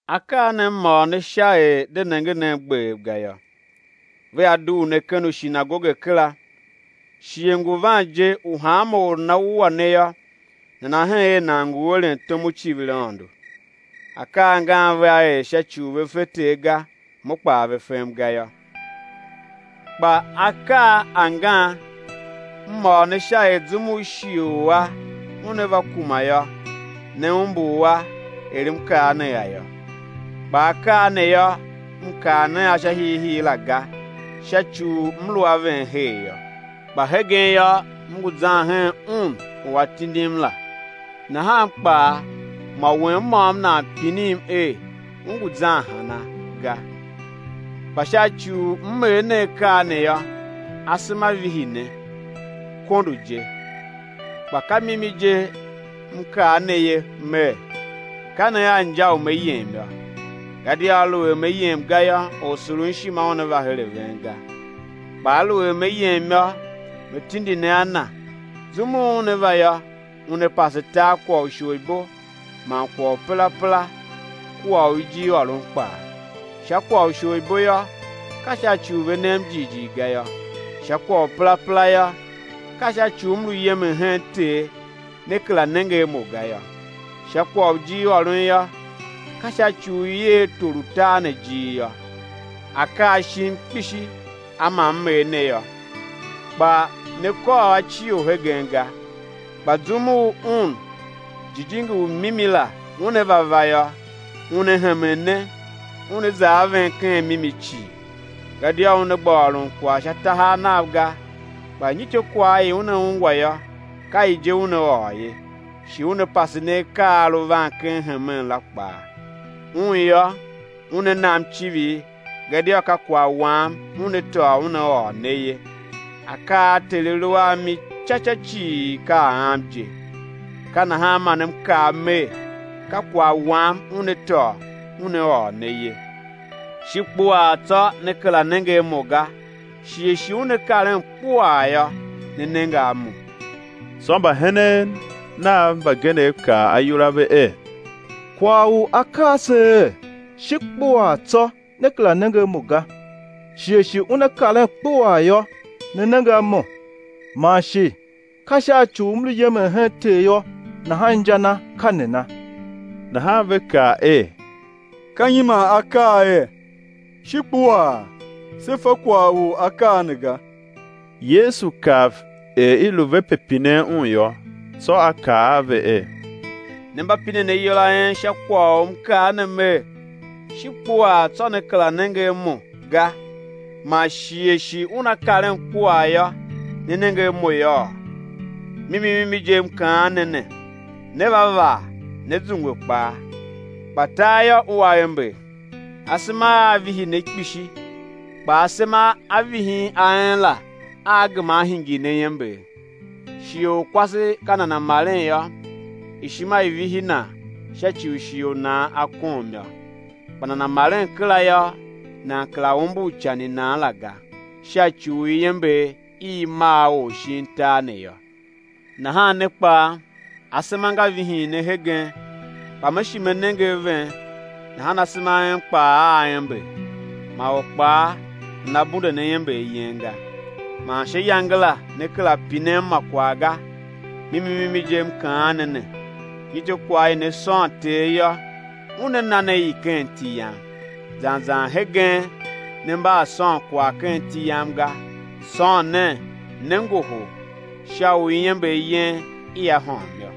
Akaa ne M ôr ne sha er de nenge nen gbev ga yô. Vea dugh ne ken ushinagoge kera; shighe ngu van je u hanma or u nana wua ne yô, nana hen er nan ngu eren tom u civir Aôndo. Akaa angan vea er sha ci u ve fe Ter ga, Mo kpaa ve fem ga yô. Kpa akaa angan M ôr ne sha er zum u shighe u a una va kuma yô, né umbur a er M kaa ne a yô; kpa akaa ne yô, M kaa ne a sha hiihii la ga, sha ci u M lu a ven her yô. Kpa hegen yô, M ngu zan hen Un u A tindim la nahan kpaa mô wen môm nan pinim er: U ngu zan hana? ga. Kpa sha ci u M er ne akaa ne yô, asema vihi ne, kondo je. Kpa ka mimi je M kaa ne ye Mer: Ka ne a inja u Me yem yô; gadia aluer Me yem ga yô, Orsurunshima Una va her a ven ga. Kpa aluer Me yem yô, Me tindi ne a Na. Zum u Una va yô, Una pase tar kwagh u isholibo man kwagh u perapera kua u ijirôron kpaa; sha kwagh u isholibo yô, ka sha ci u ve nem jighjigh ga yô; sha kwagh u perapera yô, ka sha ci u M lu yemen hen Ter, né kera nenge a Mo ga yô; sha kwagh u ijirôron yô, ka sha ci u i er tor u tar ne ijir yô. Akaa shim kpishi a ma M er ne yô, kpa ne kôr a cio hegen ga. Kpa zum u Un, Jijingi u mimi la, Una va va yô, Una hemen ne Una za a ven ken mimi cii; gadia Una gba ôron kwagh sha tahav Nav ga, kpa nyityô kwagh i Una ungwa yô, ka i je Una ôr ye, shi Una pase ne akaa a a lu van ken hemen la kpaa. Un yô, Una nam icivir gadia ka kwagh Wam Una tôô Una ôr ne ye. Akaa a Ter A lu a mi ci ca cii ka a Am je; ka nahan man M kaa Mer, ka kwagh Wam Una tôô Una ôr ne ye. Shi kpuaa tsô né kera nenge a Mo ga; shighe shi una karen kpuaa yô, né nenge a Mo. Tsô mbahenen Nav mbagenev kaa ayol a ve er: Kwagh u A kaa se er: Shi kpuaa tsô né kera nenge a Mo ga; shighe shi una karen kpuaa yô, né nenge a Mo; man shi: Ka sha ci u M lu yemen hen Ter yô, nahan inja na ka nana? Nahan ve kaa er: Ka nyi man A kaa er: Shi kpuaa? Se fa kwagh u A kaa ne ga. Yesu kav er i lu ve pe pinen Un yô, tsô A kaa a ve er: Ne mba pinen ayol a en sha kwagh u M kaa ne Mer: Shi kpuaa, tsô né kera nenge a Mo ga, man shighe shi una karen kpuaa yô, né nenge a Mo yôô? Mimi mimi je, M kaan ne ne, né va vaa, né zungwe kpaa tar yô, ua ember; asema aa vihi ne kpishi, kpa asema a vihin a en la aa gema á hingir ne iember. Shighe u kwase ka nana maren yô, ishima i vihi nan sha ci u shighe u nan a kom yô; kpa nana maren kera yô, nan kera umbur ican i nan la ga, sha ci u iember i i mar or shin tar ne yô. Nahan ne kpaa, asema nga vihin ne hegen, kpa Me shi Me nenge a ven, nahan asema a en kpaa aa ember, ma or kpaa nana bunde ne iember yen ga. Man sha iyange la né kera pinem ma kwagh ga. Mimi mimi je, M kaan ne ne, nyityô, kwagh i ne sôn Ter yô, Una na ne i ken iti Yam. Zan zan hegen ne mba a sôn kwagh ken iti Yam ga. Sôn nen, né ngohol, sha u iember yen ia hôm yô.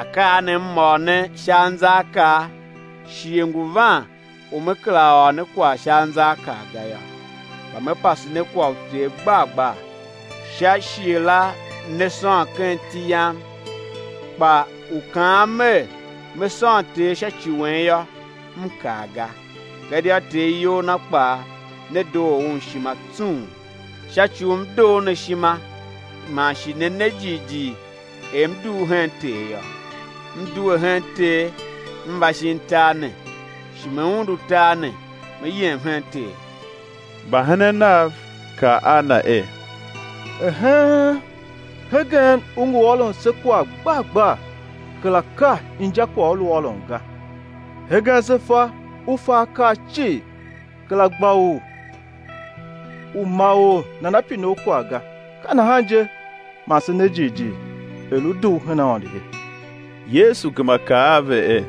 Akaa ne M ôr ne sha anzaakaa; shighe ngu van u Me kera ôr ne kwagh sha anzaakaa ga yô, kpa Me pase ne kwagh u Ter gbar gbar. Sha iyange la né sôn ken iti Yam, kpa u kaan Mer, Me sôn Ter sha ci wen yô, M kaa ga, gadia Ter iyol Na kpaa, ne doo Un ishima tsung, sha ci u M doo ne ishima, man shi ne ne jighjigh er M dugh hen Ter yô. M due hen Ter M va shin tar ne; shi Me undu tar ne, Me yem hen Ter. Mbahenen Nav kaa a Na er: Eheen, hegen U ngu ôron se kwagh gbar gbar, kera ka injakwagh U lu ôron ga. Hegen se fa U fa akaa cii, kera gba U u ma or nana pine U kwagh ga, ka nahan je man se ne jighjigh er U dugh her Aôndo ye. Yesu gema kaa a ve er: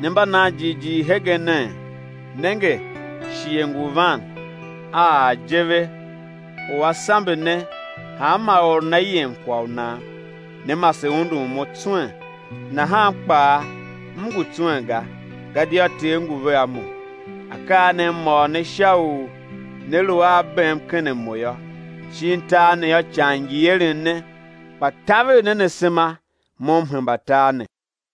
Ne mba nan jighjigh hegenee? Nenge, shighe ngu van, a ar je ve u á sambe ne, hanma or nana yem kwagh u nan, né mase undun Mo tswen; nahan kpaa M ngu tswen ga, gadia Ter ngu vea Mo. Akaa ne M ôr ne sha u né lu a bem ken a Mo yô. Shin tar ne yô, ican ngi eren ne; kpa taver nen asema, Mo M hemba tar ne.